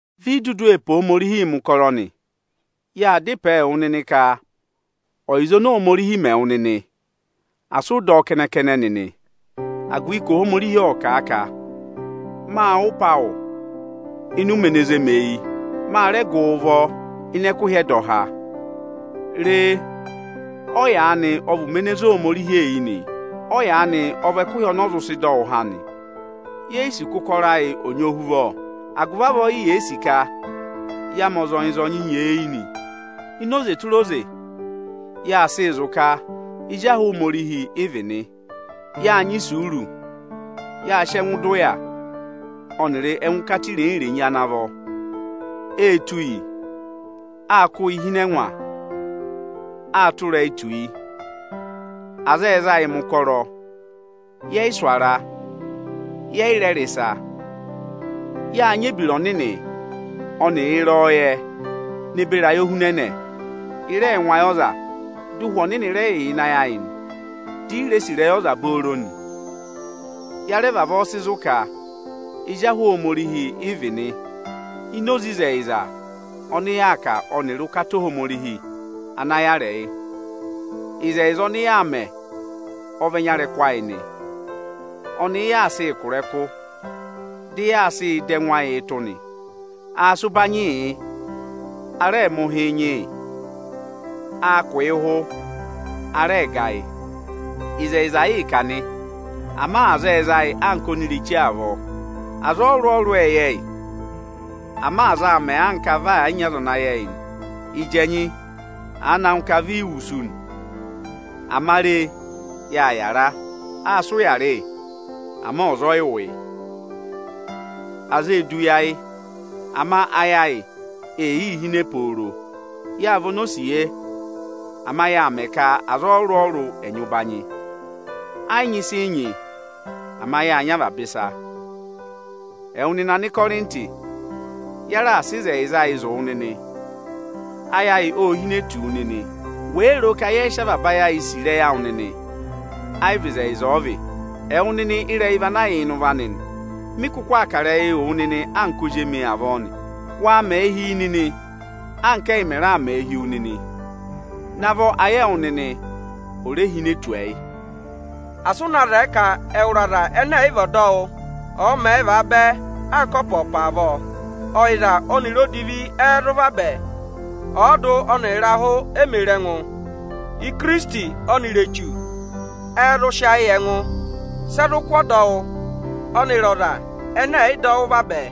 Vi i dudu ee pe Ohomorihii mẹ̀ ụkọrọ nị. Yaa da ịpẹẹ wụ nịnị ka ọyịza oni Ohomorihi mẹ wụ nịnị, asị ụ dọ ọ kẹnẹ-kẹnẹ nịnị, agụvị ka Ohomorihi ộ kà a ka: Ọnị ộ wụ́ ịpẹ awụ nịnị ịnị ụmẹ ene zé oni eyi; Ọnị ọ́ rẹ gụ wụ nịnị ụvọ ịnị ẹkụhị ẹdọha. Re, ọyaanị ọ vị ụmẹ ene zé Ohomorihi eyi nị; ọyaanị ọ vị ẹkụhị ọ vị ẹkụhị ọnị ọ zụ sị dọ wụ nịnị há nị. Ye yi sì ka ụkọrọ ayị ọ̀ nyị ohuvọ, agụvị avọọ i ye yi sì ka ya mẹ ọzọnyị-ọzọnyị nyeeyi nị. Ini oze tụra oze, yaa sịị zụ̀ ka ezi ahụ Ohomorihi ị vị̀ nị: Yâ nyị isuuru, yâ sị ẹngụ dọ ụya ọnịrị ẹngụkata irenyi-irenyi ana vọ. Ê tụ́ yị, á kụ́ yị hi ịnị ẹngwa, â tụ́ ịrẹyị tù yị. Aza ệ za yị mẹ̀ ụkọrọ, yẹ yị sụ̀ ara, yẹ yị rẹ rị ịsa. Yâ nyị ebira ọnịnị ọnịrị ịrẹyọyẹ ne beri ayohunẹnẹ, ị rẹẹ̄ ngụ ayị ọza. Dị Ụhwẹ Ohomorihi rẹ yà ịnị ayị ayị nị, dị ị ree sì ịrẹyị ọza Ya rẹ vavọọ sị zụ̀ ka ezi ahụ Ohomorihi ị vị̀ nị ini oze ịzẹyịza ọnị yaa kà ọnịrị ụkata Ohomorihi ana yàrị ẹyị. Ịzẹyịza ọnị yaa mẹ ọ vị ẹnya ịrẹkụ ayị nị, ọnị ị yaa sịị kụ̀ ịrẹkụ, dị yaa sịị dọ ẹngụ ayịị tụ́ nị. Â sị ụbanyị yị, a rẹ mẹ̀ ụhị nyị yị. Â kụ̀ yị ụhụ, a rẹ ga yị. Ịzẹyịza ịị̄ kà nị, ama aza ệ za yị anka onireche avọọ. Aza ọrụrụ-ọrụrụ ệ yẹ yị, ama aza aa mẹ anka vị ẹ̀ yị nyị ọza ana yẹ yị nị. Ịjị ẹnyị àa na ngụ ka vị i wusu nị, ama ya yị yàra. Â sị ụya rị yị, ama ọza ọ yị wụ yị. Aza ee du yi ayị, ama ayị ayị ee yii hine pooro. Yâ vị onosiye, ama yâ mẹ ka aza ọrụrụ-ọrụrụ ẹ̀ nyị ụbanyị, ẹ yị nyị ịsị nyị, ama yá nyị avaba ịsa. Ẹwụ nịnị Anịkọrịntị, ya raà sị ịzẹyịza ayị zụ̀ wụ nịnị, ayị ayị ô hine tù wu nịnị. Wèe roo nịnị ka yẹ yị sị avaba ayị sì ịrẹyị awụ nịnị, ẹ yị vị ịzẹyịza ọ vị. Ẹwụ nịnị ịrẹyị vị ana yà ịnị ụvọ anị nị. Mị kụkụ aa kà ịrẹyịị wụ nịnị anka ozi emi avọọ nị. Waa mẹẹ hi yi nịnị anka, ẹyị mẹ raà mẹ hi wu nịnị: Navọ ayị ẹwụ nịnị ò re hine tù ẹyị! Asị ụ na zẹẹ ka ẹwụrị aza ẹnẹ ẹ̀ yị vị ọdọwụ ọ̀ọ mẹẹ vaabẹ anka ọpa-ọpa avọọ! Ọyịza ọnịrị odivi ẹ́ẹ́ zụ vabẹ? Ọọdụ ọnịrị ịrahụ e mē re ẹngụ. Ikirisiti ọnịrị Echu ẹ́ẹ́ zụ sị ayị yị ẹngụ? Sị ẹ zụ kụ́ ọdọwụ ọnịrị ọza ọnịrị ọza ẹnẹ ẹ̀ yị dọ wụ́ vabẹ?